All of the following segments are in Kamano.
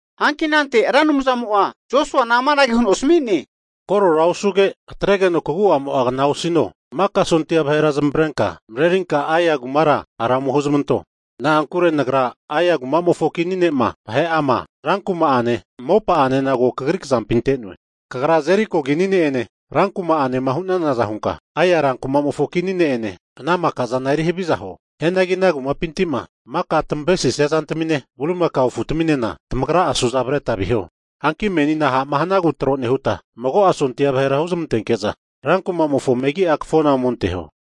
Hanki anante Ra Anumzamo'a Josuana amanage huno asami'ne, Korora osuge, atregeno kagu'amo'a kna osino. Maka sondia vahera zamavarenka marerinka Ai kumara hara ome huzamanto. Na'ankure Nagra Ai kuma'mofo kini ne'ma, vahe'ama, ran kuma'ane, mopa'anena ko kagri kzampi ante'noe. Kagra Jeriko kini ne'ene rankuma'anema hu'nanaza hunka, Ai rankuma'mofo kini ne'ene ana maka'zana eri haviza huo. Hianagi ana kumapinti'ma maka tamavesisia zantamine bulimakao afutaminena tamagra'a suza avreta viho. Hanki menina ha'ma hanagu tro nehuta, mago'a sondia vahera huzmantenke'za rankumamofo mefiga'a kafona omenteho.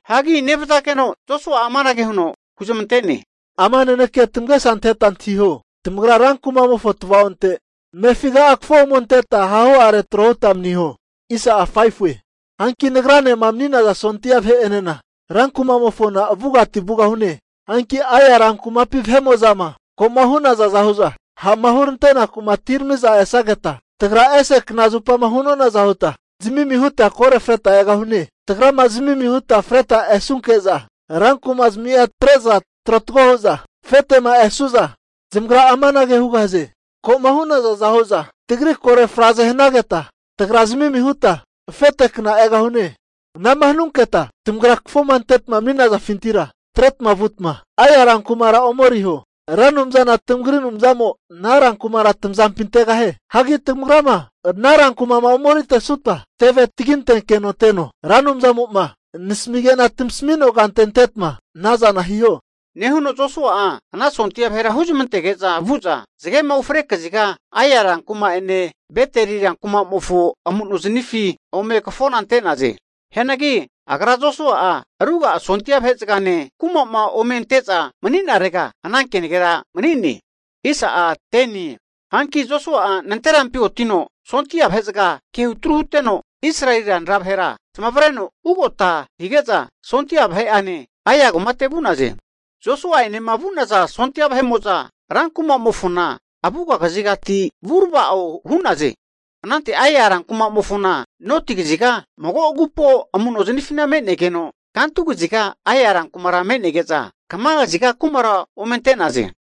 Hagi nevzageno Josua'a amanage huno huzmante'ne, Ama nanekea tamagesa anteta antahiho, tamagra rankuma'mofo tvaonte amefiga'a kafo ome anteta hahu'are tro huta umaniho. Hanki nagranema mani'naza sondia vahe'enena rankuma'mofona avugati vugahune. Hanki Ai rankumapi vahe'mo'zama ko'ma hu'nazaza hu'za ha'ma hurante'naku atiramiza esnageta, tagra ese knazupama hu'nonaza huta zamimi huta koro freta egahune. Tagra zami'mi huta freta esunke'za, rankuma'zmia atre'za trotago hu'za afete'ma esu'za zamagra amanage hugahaze, ko'ma hu'nazaza hu'za tagri koro fraze nehanageta, tagra zami'mi huta afete kna egahune. Anama hanunketa tamagra kafoma antetama mani'nafintira atretma vutma, Ai rankumara ome eriho. Ra Anumzana tamagri Anumzamo'a ana rankumara tazampi antegahie. Hagi tamagrama ana rankuma'ma ome eritesuta, teve tagintenkeno teno. Ra Anumzamo'ma nasamige'na tamasami'noa kante antetma anazana hiho. Nehuno Josua'a ana sondia vahera huzmantege'za vu'za zagema ufre kaziga Ai rankuma'ene Beteli rankuma'mofo amu'nozanifi ome kafona ante'naze. Hianagi agra Josua'a ruga'a sondia vahezagane kumama ome ante'za mani'narega ana kenagera mani'ne. Hanki Josua'a nanterampi otino sondia vahe'zaga kehu tru huteno, Israeli ranra vahera zamavareno ugota hige'za sondia vahe'ane Ai kumate vu'naze. Josua'enema vu'naza sondia vahe'mo'za rankumamofona avuga kazigati vurava'o hu'naze. Anante Ai rankumamofona noti kaziga mago agupo amu'nozamifina me'negeno kantu kaziga Ai rankuma me'nege'za, kamakaziga kumara omente'naze.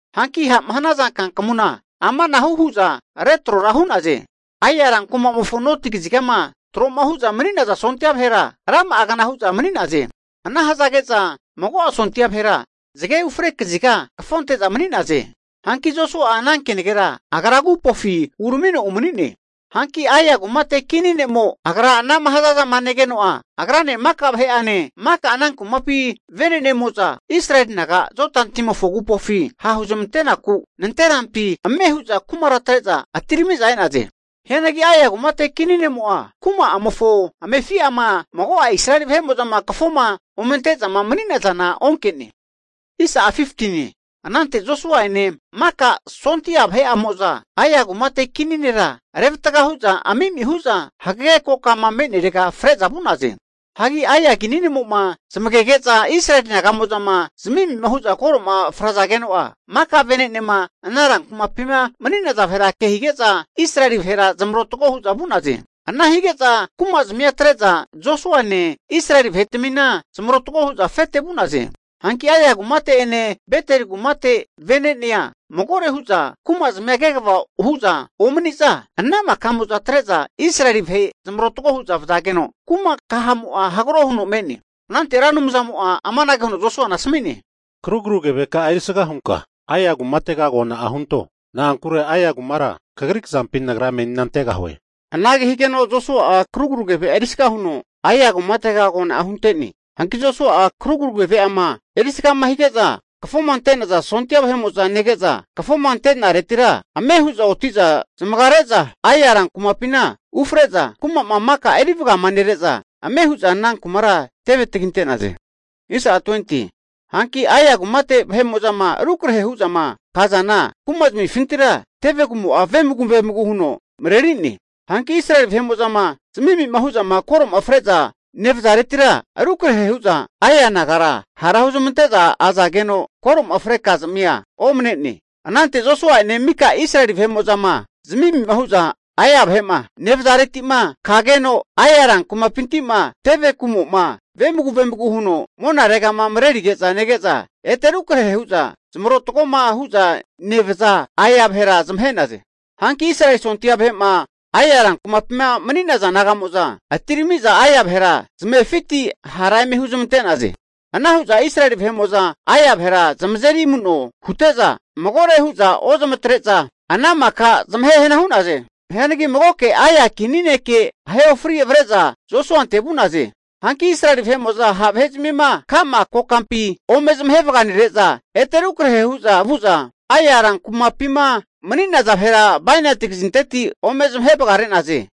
Hanki ha'ma hanaza kankamuna amanahu hu'za retrora hu'naze. Ai rankumamofo noti kazigama tro'ma hu'za mani'naza sondia vahera rama'agna hu'za mani'naze. Ana hazage'za mago'a sondia vahera zage ufre kaziga kafonte'za mani'naze. Hanki Josua'a ana kenagera agra agupofi uramino umani'ne. Hanki Ai kumate kini ne'mo'ma agra anama hazazama negeno'a, agrane maka vahe'ane, maka ana kumapi vene'nemo'za Israeli naga Jodani agupofi ha' huzmanteku nanterampi ame hu'za kumara atre'za atirami'za e'naze. Hianagi Ai kumate kini ne'mo'a kuma'amofo amefi'ama mago'a Israeli vahe'mo'zama kafoma omente'zama mani'nazana onke'ne. Anante Josua'ene maka sondia vahe'amo'za Ai kumate kini nera revatga hu'za ami'mi hu'za hagege kokama me'nerega fre'za vu'naze. Hagi Ai kini ne'mo'ma zamagege'za Israeli naga'mo'zama zami'mi hu'za koroma frazageno'a, maka venenema ana rankumapima mani'naza vahera ke hige'za, Israeli vahera zamarotago hu'za vu'naze. Ana hige'za kumazamia atre'za Josuane Israeli vahetamina zamarotgo hu'za afete vu'naze. Hanki Ai kumate'ene Beteli kumate vene'nea magore hu'za kumazmia kegava hu'za omani'za, ana maka'mo'za atre'za Israeli vahe zamarotago hu'za vazageno, kuma kahamo'a hagro huno me'ne. Anante Ra Anumzamo'a amanage huno Josuana asami'ne, Karugru keveka'a erisga hunka Ai kumatega agona'a hunto, na'ankure Ai kumara kagri kzampi Nagra menina antegahue. Anage higeno Josua'a krugru keve'a erisga huno Ai kumatega agona'a hunte'ne. Hanki Josua'a karugru keve'ama erisgama hige'za kafoma ante'naza sondia vahe'mo'za nege'za, kafoma ante'naretira ame hu'za oti'za zamagare'za Ai rankumapina ufre'za, kuma'ma maka erivagamanere'za ame hu'za ana kumara teve taginte'naze. Hanki Ai kumate vene'nemo'zama rukrahe hu'zama kazana kuma'zamifintira tevegumo'a vemagu vemagu huno mareri'ne. Hanki Israeli vahe'mo'zama zami'mi hu'za koro'ma fre'za nevazaretira rukrahe hu'za, Ai nagara hara hu'zamante'za azageno, koro'ma fre'naza kazamia omnene. Anante Josua'ene mika Israeli vahe'mo'zama zami'mi hu'za Ai vahe'ma nevazareti'ma, kageno Ai rankumapinti'ma teve kumo'ma vemagu vemagu huno monaregama marerige'za nege'za ete rukrahe hu'za zamarotagoma hu'za nevaza Ai vahera zamahe'naze. Hanki Israeli sondia vahe'ma Ai rankumapima mani'naza naga'mo'za atiramiza Ai vahera zamefiti hara eme huzmante'naze. Ana hu'za Israeli vahe'mo'za Ai vahera zamazeri amu'no hute'za magore hu'za ozamatre'za, ana maka zamahe hana hu'naze. Hianagi magoke Ai kini ne'ke ahe ofri avre'za Josuante vu'naze. Hanki Israeli vahe'mo'za ha' vahezmima, ka'ma kokampi ome zamahe vaganere'za ete rukrahe hu'za vu'za, Ai rankumapima mani'naza vahera bainati kazinteti ome zamahe vagare'naze.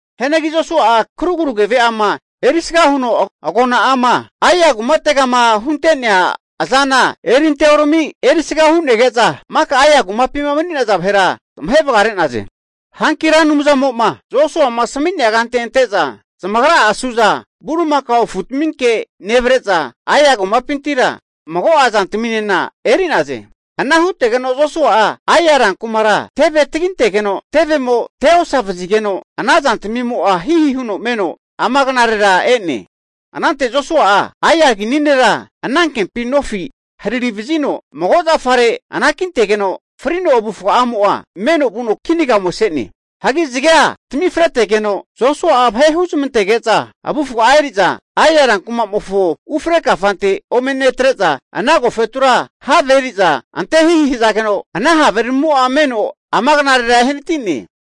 Hianagi Josua'a karugru keve'ama erisga huno agona'ama Ai kumategama hunte'nea azana erinte orami erisga hu'nege'za, maka Ai kumapima mani'naza vahera zamahe vagare'naze. Hanki Ra Anumzamo'ma Josuama asmi'nea kante ante'za, zamagra'a suza bulimakao afutaminke nevre'za, Ai kumapintira mago'a zantaminena eri'naze. Ana hutegeno Josua'a Ai rankumara teve tagintegeno tevemo te osavazigeno ana zantamimo'a hihi huno meno ama knarera e'ne. Anante Josua'a Ai kini nera anankempi nofi harari vazino mago zafare anakintegeno frino avufga'amo'a meno vuno kinaga ome se'ne. Hagi zagea tamifretegeno, Josua'a vahe huzmantege'za avufga'a eri'za Ai rankumamofo ufre kafante ome netre'za, ana agofetura have eri'za antehihi hazageno, ana haveramimo'a meno ama knarera ehanati'ne.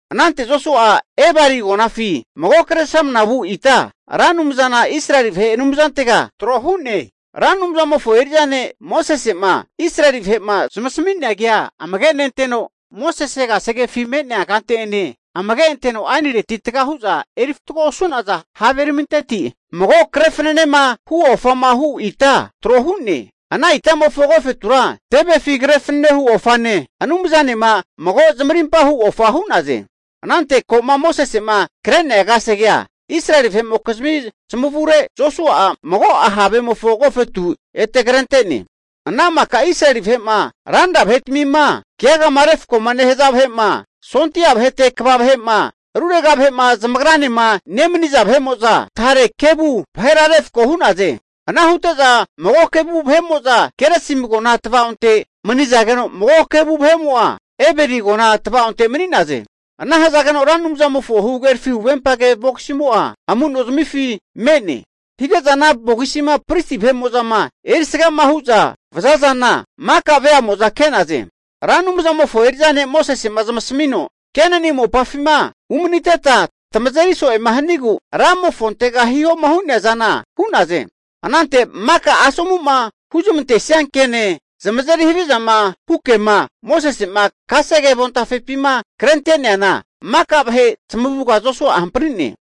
Anante Josua'a Ebali agonafi mago kresramna vu ita Ra Anumzana Israeli vahe Anumzantega tro hu'ne. Ra Anumzamofo eri'za ne' Mosese'ma Israeli vahe'ma zamasami'nea kea amage nenteno, Mosese kasegefi me'nea kante'ene amage anteno aenireti taga hu'za eri fatgo osu'naza haveraminteti, mago kre fananema hu ofama hu ita trohu'ne. Ana itamofo agofetura tevefi kre fananehu ofane, Anumzanema mago zamarimpa hu ofa hu'naze. Anante ko'ma Mosese'ma kre'nea kasegea Israeli vahe'mokizmi zamavure Josua'a mago'a havemofo agofetu ete krente'ne. Ana maka Israeli vahe'ma ranra vahetamima keagama refkoma nehaza vahe'ma, sondia vahete kva vahe'ma, rurega vahe'ma zamagranema nemaniza vahe'mo'za tare kevu vahera refko hu'naze. Ana hute'za mago kevu vahe'mo'za Gerisim agona tava'onte manizageno, mago kevu vahe'mo'za Ebeli agona tvaonte mani'naze. Ana hazageno Ra Anumzamofo huhagerafi huvempage vogisimo'a amu'nozamifi me'ne. Hige'za ana vogisima pristi vahe'mo'zama erisgama hu'za vazazana maka veamo'za ke'naze. Ra Anumzamofo eri'za ne' Mosese'ma zamasamino, Kenani mopafima umaniteta tamazeri so'e hanigu Ramofontega hihoma hu'nea zana hu'naze. Anante maka asomu'ma huzmantesia ke'ne, zamazeri havizama hu kema Mosese'ma kasege avontafepima krente'neana maka vahe zamavuga Josua'a hamprine.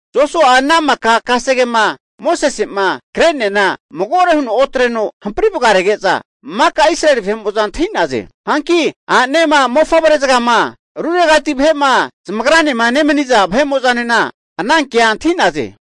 Josua'a ana maka kasegema Mosese'ma kre'neana magore huno otreno hampri vagarege'za, maka Israeli vahe'mo'za antahi'naze. Hanki a'ne'ma, mofavre zagama, ruregati vahe'ma zamagranema nemaniza nena ana kea antahi'naze.